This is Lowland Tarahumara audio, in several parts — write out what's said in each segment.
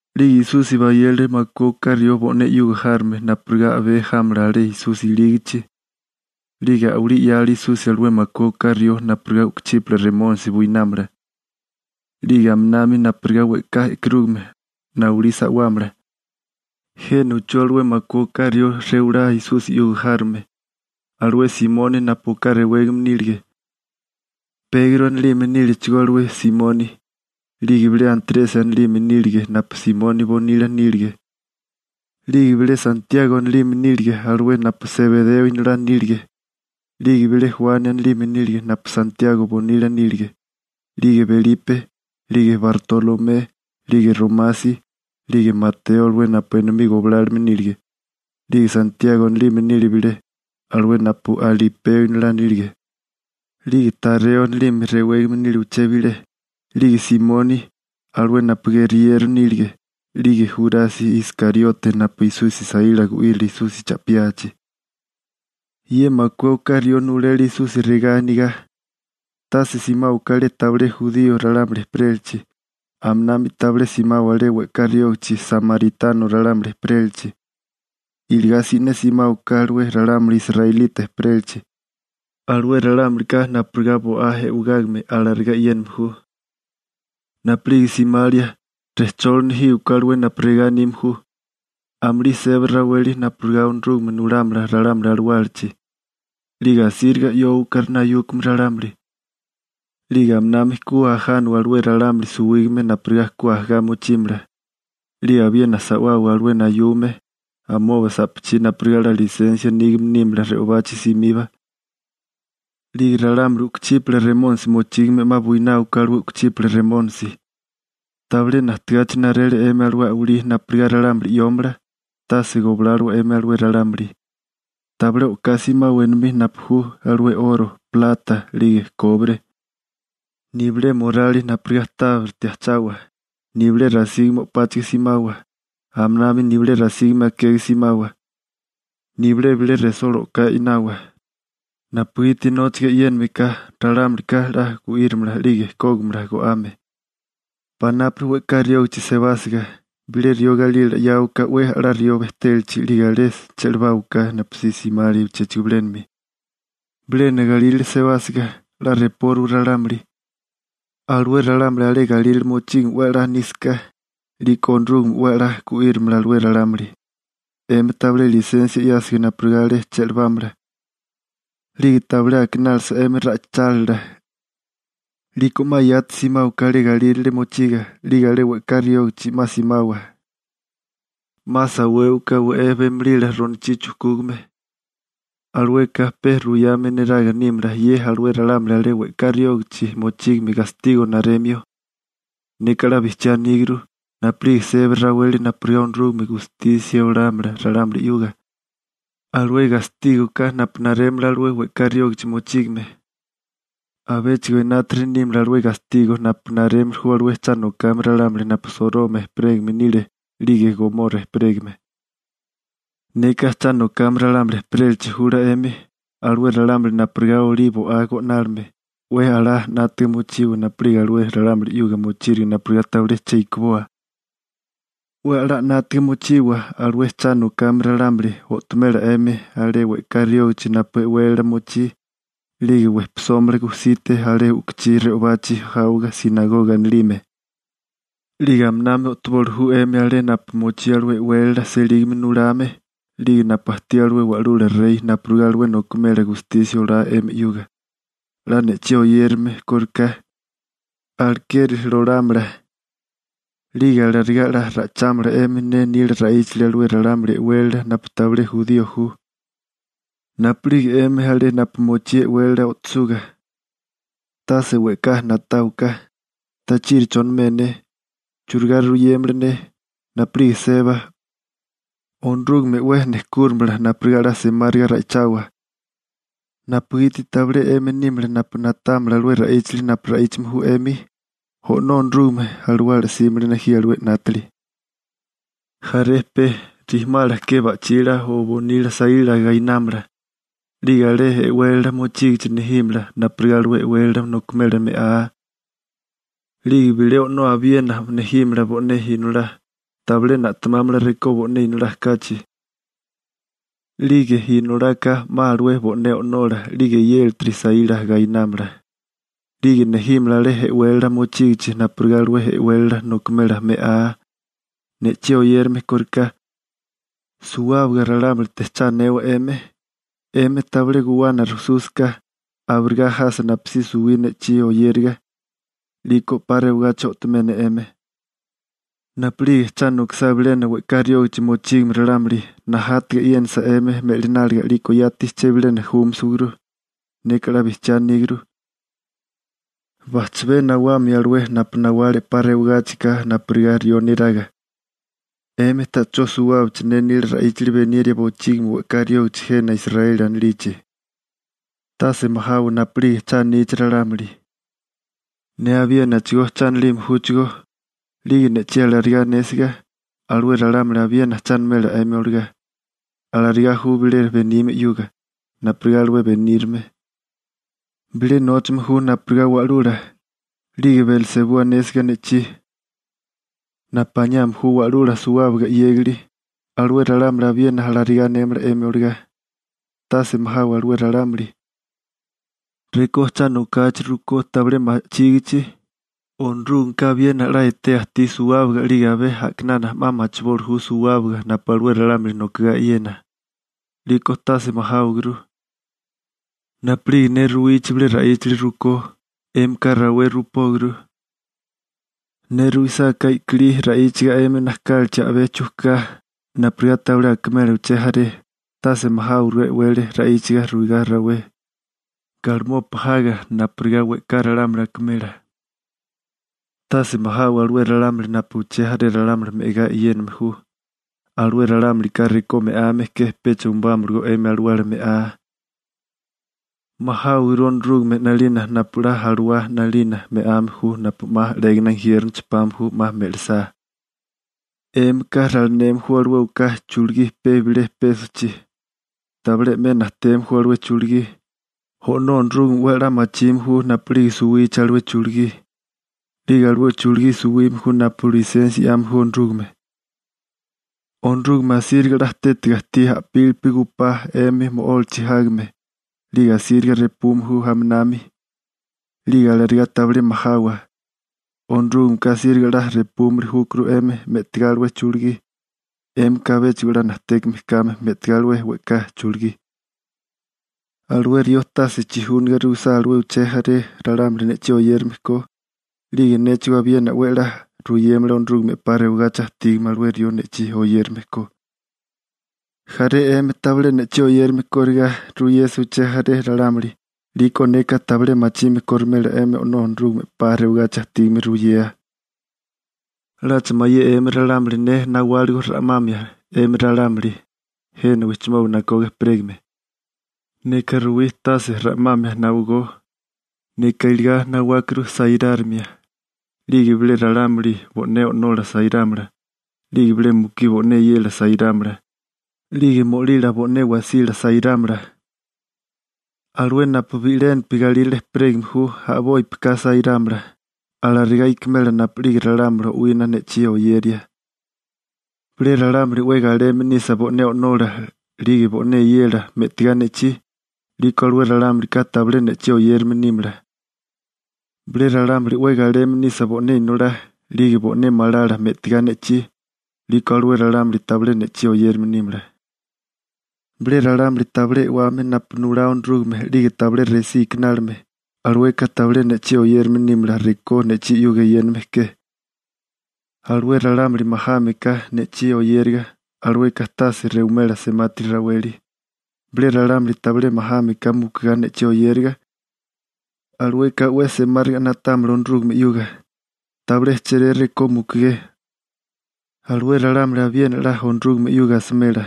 'Lige Esusi bayele alué makué oká rió bo'né 'yuga járome napurigá a'bé jámala alé Esusi ilígichi. 'Lige a'walí 'yale Esusi alué makué oká rió napurigá u'kuchípala remónisi buinámala, 'lige aminami napurigá we'ká e'karúgame nawalí sa'wámala. Jena uchú alué makué oká rió rewalá Esusi 'yuga járome: alué Simoni napu oká rewégame nílige, Pegro anilime níligechigó alué Simoni, 'lige bilé Antresi anilime nílige napu Simoni bonila nílige, 'lige bilé Santiago anilime nílige alué napu Sebereo inolá nílige, 'lige bilé Juani anilime nílige napu Santiago bonila nílige, 'lige Belipe, 'lige Bartolomé, 'lige Romasi, 'lige Mateo alué napu enomí goblálome nílige, 'lige Santiago anilime nile bilé, alué napu Alipeo inolá nílige, 'lige Tareo anilime rewégame nile uché bilé, 'lige Simoni, alué napu geriyero nílige, 'lige Jurasi Iskariote napu Esusi saíla gu'írile Esusi cha'piachi. Ye makué oká rió nulele Esusi regá anigá: ―Tase simáwaká alé tabilé jurío ralámuli ejperélachi. Aminami tabilé simawa alé we'ká riógichi Samaritano ralámuli ejperélachi. Iligá si'né simáwaká alué ralámuli israelita ejperélachi. Alué ralámulika napurigá bo'á e'wegágame, alarigá e'yéname ju. Napu'lige simalia, rejcholi nejíwaká alué napu regá anime ju: «Amulí seba raweli napurigá Onorúgame nulámala ralámuli alawálachi.» 'Lige asíriga 'yóowaká nayúkame ralámuli, 'lige aminami ku ajánawa alué ralámuli suwígame napurigá ku ajagá mochímala. 'Lige abiena sa'wawa alué nayume amoba sa'pachí napurigá 'la lisensia nígame nímala re'obachi simiba. 'Lige ralámuli u'kuchípala remónisi mochígame 'ma buináwaká alué u'kuchípala remónisi. Tabilé najtegachi narele 'emi alué a'walí napurigá ralámuli 'yómala, tase goblálowa 'emi alué ralámuli. › Tabilé o'ká simawa enomí napu ju alué 'oro, plata, 'lige kobre. Nibilé morali napurigá tábiriti ajchawa, nibilé rasígame o'páchiga simawa. Aminami nibilé rasígame akega simawa, nibilé bilé resola o'ká e'nawa, napugiti nóchaga e'yéname ka, ralámulika 'la gu'írimala 'lige kógimala go'ame. › Panápuri we'ká riógichi sebásiga, bilé rió galila 'yáwaká 'we a'lá rió bejtélachi 'lige alé che'lebáwaká napusí simalia uchéchigo bilénami. Bilena galírale sebásiga, 'la repóriwa ralámuli. Alué ralámuli alé galírale mochígame 'we a'lá nísaká, 'liko Onorúgame 'we a'lá gu'írimala alué ralámuli. 'Emi tabilé lisensia 'yásiga napurigá alé che'lebámala, 'lige tabilé akinálisa 'emi ra'ichálila, 'liko 'ma yati simáwaká alé galírale mochiga. 'Lige alé we'ká riógichi 'ma simawa. 'Ma sawéwaká we'é bemolila ronochí chujkúgame. (Alueka pe ruyame neraga nímala ye alué ralámuli alé we'ká riógichi mochígame gastigo naremio.) Neka 'la bijchiá aníguru, napu'lige seba raweli napurigá Onorúgame gustisia olámala ralámuli 'yuga, alué gastígoká napu narémala alué we'ká riógichi mochígame, abéchigo enátiri nímala alué gastigo napu narémili ju alué cha nokame ralámuli napu Soroma ejperégame nile 'lige Gomora ejperégame. › ¡Neka cha nokame ralámuli ejperélachi jula 'emi, alué ralámuli napurigá olí bo'á go'nálime! 'We a'lá 'nátiga mochiwa napu'lige alué ralámuli 'yuga mochíriga napurigá tabilé che ikiboa. 'We a'lá 'nátaga mochiwa, alué cha nokame ralámuli o'tomela 'emi alé we'ká riógichi napu e'wélala mochí. 'Lige wejpisómala gujsite alé u'kuchí re'obachi jáwoga «sinagoga» anilime. 'Lige aminami o'toboli ju 'emi alé napu mochí alué e'wélala selígame nulame, 'lige napu ajtí alué wa'lula rey napurigá alué nokimela gustisia olá 'emi 'yuga, 'la ne'chí oyérame kóriká, alekeri lolámala. 'Lige alarigá 'la ra'ichámala 'emi ne nila ra'íchali alué ralámuli e'wélala napu tabilé jurío ju. Napu'lige 'emi alé napu mochí e'wélala o'tosuga, tase we'ká na'táwaká: «¿Tachiri chonimé ne? ¿Churigá ruyémala ne?» Napu'lige seba, Onorúgame 'we nejkúrimala napurigá 'la semáriga ra'ichawa, napugiti tabilé 'emi nímala napu na'támala alué ra'íchali napu ra'íchame ju 'emi, O'nó Onorúgame Alawala 'símala nejía alué 'nátili. › Jaré pe rijimala ke ba'chila o bonila saíla gainámala. 'Lige alé e'wélala mochígichi nejímala napurigá alué e'wélala nokimela me'á. 'Lige bilé o'nó abiena 'ma nejímala bo'né inolá. Tabilé na'temámala rekó bo'né inolá kachi. 'Lige inolaka 'ma alué bo'né o'nola 'lige eyélatiri saíla gainámala, 'lige nejímala alé e'wélala mochígichi napurigá alué e'wélala nokimela me'á. Ne'chí oyérame kóriká, suwábaga ralámulite cha anewa 'emi. 'Emi tabilé guwana rujsúsaká, abirigá jasa napusí suwí ne'chí oyériga, 'liko 'pa rewagachi o'tomé ne 'emi. Napu'lige cha nokisá bilena we'ká riógichi mochígame ralámuli, najátaga e'yénasa 'emi me'lináliga 'liko yati chebilena júmasawaguru. Neka 'la bijchiá aníguru, bajchabé nawamio alué napu nawale 'pa rewagáchika napurigá rió neraga 'emi ta'chó suwábichi ne nila ra'íchali beniria bochígimi we'ká riógachi jena Israeli anilichi. › Tase majawa napu'lige cha anichi ralámuli. Ne abiénachigó cha anilime júchigó, 'lige ne'chí alarigá anésiga, alué ralámuli abiena cha animela 'emi olagá. Alarigá ju bilé benime 'yuga, napurigá alué benírame. Bilé nóchame ju napurigá wa'lula. 'Lige Belsebú anésiga ne'chí, napu aniame ju Wa'lula Suwábaga 'Yégili, alué ralámuli abiena alarigá anémala 'emi olagá. › Tase majawa alué ralámuli. Rekó cha nokachi rukó tabilé ma'chígichi, Onorúgameka abiena 'la etea ajtí suwábaga 'lige abé a'kinana 'ma machiboli ju suwábaga napu alué ralámuli nokogá e'yena. 'Liko tase majáwaguru. Napu'lige ne ruwichi bilé ra'íchali rukó, 'émika rawé ruipóguru. Ne ruisáká i'kilí ra'íchaga 'emi najkálichi a'bé chujká napurigá tabilé akémala uché jaré, tase majáwaguru e'wele ra'íchaga ruigá rawé galimopa jaga napurigá we'ká ralámuli akimela. Tase majawa alué ralámuli napu uché jaré ralámuli me'agá e'yéname ju, alué ralámulika rekó me'ame ke pecha umubámalagó 'emi alawala me'á. Majáwaguru Onorúgame 'nalina napu 'la alawala 'nalina me'ame ju napu 'ma 'légana injiérnochi pame ju 'ma me'lisá. › ¿'Émika ralineme ju alué oká chulugí pe bilé pésochi? Tabilé 'me najteme ju alué chulugí, O'nó Onorúgame 'we a'lá machime ju napu'lige suwichi alué chulugí. 'Lige alué chulugí suwime ju napu lisensia 'yame ju Onorúgame. Onorúgame asíriga 'la tétiga ajtí a'pílipi gujpá 'emi mo'ólachi jágame, 'lige asíriga repume ju aminami. 'Lige alarigá tabilé majawa, Onorúgameka asíriga 'la repúmili júkuru 'emi me'tigá alué chulugí, 'émika abéchigo 'la najtékame kame me'tigá alué we'ká chulugí. › Alué rió tase chijúnaga ruisá alué uché jaré ralámuli ne'chí oyérame ko, 'lige néchigó abiena 'we a'lá ruyémala Onorúgame 'pa rewagachi ajtígame alué rió ne'chí oyérame ko. Jaré 'emi tabilé ne'chí oyérame korigá ruyésaká uché jaré ralámuli, 'liko neka tabilé machime korimela 'emi O'nó Onorúgame 'pa rewagachi ajtígame ruyea. › ¿'Lacha mayé 'emi ralámuli ne nawáligo ra'mamia 'emi ralámuli jena wijchimoba nakoga ejperégame? Neka ruwí tase ra'mamia nawagó. Neka iligá nawákuru sairárimia. 'Lige bilé ralámuli bo'né o'nola sairámala. 'Lige bilé mukí bo'né eyela sairámala. 'Lige mo'lila bo'né wasila sairámala. Alué napu bi'lénapi galírale ejperégame ju a'bópika sairámala. Alarigá ikimela napu'lige ralámuli o'wina ne'chí oyeria. › Bilé ralámuli 'we galeme nisa bo'né o'nola 'lige bo'né eyela me'tigá ne'chí, 'liko alué ralámulika tabilé ne'chí oyérame nímala. Bilé ralámuli 'we galeme nisa bo'né inolá 'lige bo'né malala me'tigá ne'chí, 'liko alué ralámuli tabilé ne'chí oyérame nímala. Bilé ralámuli tabilé e'wame napu nulá Onorúgame 'lige tabilé resí ikinálime, alueka tabilé ne'chí oyérame nímala rekó ne'chí 'yuga eyéname ke. Alué ralámuli majame ka ne'chí oyériga, alueka tase rewimela semati raweli. Bilé ralámuli tabilé majáme ka mukigá ne'chí oyériga, alueka 'we semáriga na'támala Onorúgame 'yuga. Tabilé chéré rekó mukugé, alué ralámuli abiena 'la Onorúgame 'yuga asimela. ›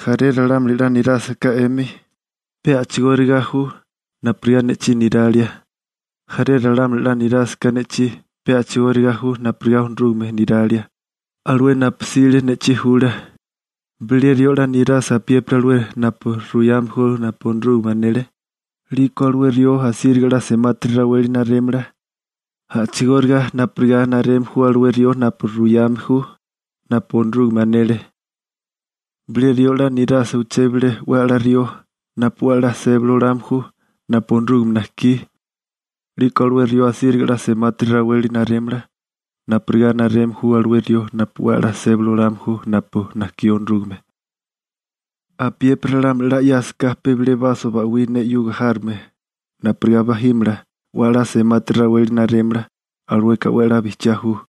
Jaré ralámuli 'la nirásaká 'emi, pe a'chigóriga ju napurigá ne'chí niralia. Jaré ralámuli 'la nirásaká ne'chí, pe a'chigóriga ju napurigá Onorúgame niralia, alué napu 'sile ne'chí jula. Bilé rió 'la nirasa apiépiri alué napu ruyame ju napu Onorúgame anele, 'liko alué rió asíriga 'la semati raweli narémala, a'chigóriga napurigá nareme ju alué rió napu ruyame ju napu Onorúgame anele. Bilé rió 'la nirásaká uché bilé 'we a'lá rió napu 'we a'lá sébali olame ju napu Onorúgame najkí, 'liko alué rió asíriga 'la semati raweli narémala napurigá nareme ju alué rió napu 'we a'lá sébali olame ju napu najkí Onorúgame. Apiépiri ralámuli 'la 'yásaká pe bilé baso ba'wí ne 'yuga járome napurigá bajímala, 'we a'lá semati raweli narémala. Alueka 'we a'lá bijchiá ju.